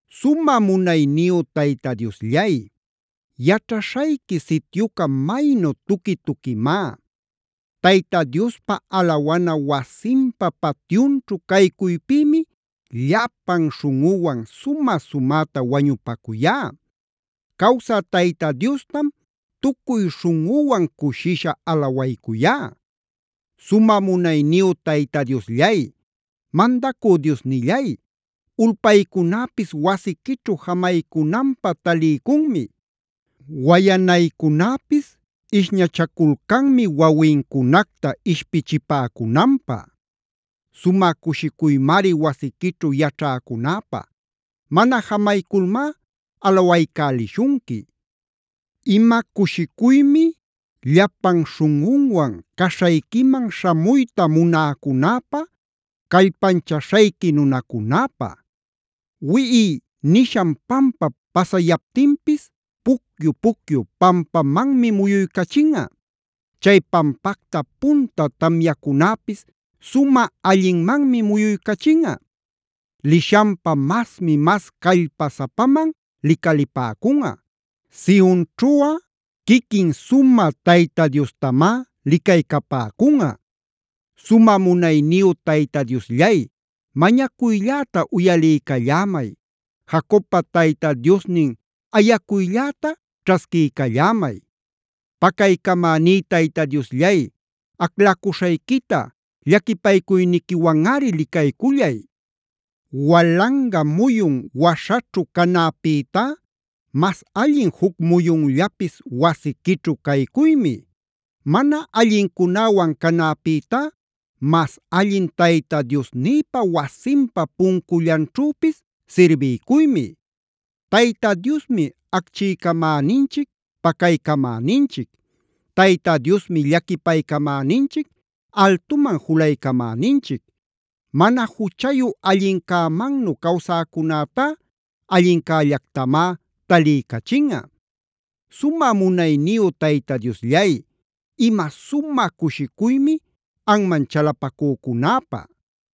Sumä munayniyu Tayta Diosllay, yaćhaśhayqui sityuca maynu tuqui-tuquimá. Tayta Diospa alawana wasinpa patyunćhu caycuypïmi llapan śhunꞌüwan sumä-sumäta wañupacuyá. Cawsä Tayta Diostam tucuy śhunꞌüwan cushisha alawaycuyá. Sumä munayniyu Tayta Diosllay, mandacü Diosnillay, ulpaycunäpis wasiquićhu jamaycunanpä taliycunmi. Wayanaycunäpis ishnachaculcanmi wawincunacta ishpichipäcunanpä. Sumä cushicuymari wasiquićhu yaćhäcunäpä. Mana jamayculmá alawaycälishunqui. Ima cushicuymi llapan śhunꞌunwan caśhayquiman śhamuyta munäcunäpä, callpanchaśhayqui nunacunäpä. Wiꞌiya nishan pampap pasayaptinpis pucyu-pucyu pampamanmi muyuycachinꞌa. Chay pampacta punta tamyacunäpis sumä allinmanmi muyuycachinꞌa. Lishanpa masmi mas callpasapaman licalipäcunꞌa. Sionćhuꞌa quiquin sumä Tayta Diostamá licaycapäcunꞌa. Sumä munayniyu Tayta Diosllay mañacuylläta uyaliycallämay. Jacobpa Tayta Diosnin ayacuylläta ćhasquiycallämay. Pacaycamäní Tayta Diosllay, aclacuśhayquita llaquipaycuyniquiwanꞌari licaycullay. Walanga muyun waśhaćhu canäpïtá mas allin juc muyunllapis wasiquićhu caycuymi. Mana allincunäwan canäpïtá mas allin Tayta Diosnïpa wasinpa puncullanćhüpis sirbiycuymi. Tayta Diosmi acchiycamäninchic pacaycamäninchic. Tayta Diosmi llaquipaycamäninchic, altuman julaycamäninchic. Mana juchayu allincämannu cawsäcunätá allincällactamá taliycachinꞌa. Sumä munayniyu Tayta Diosllay, ima sumä cushicuymi anman chalapacücunäpä.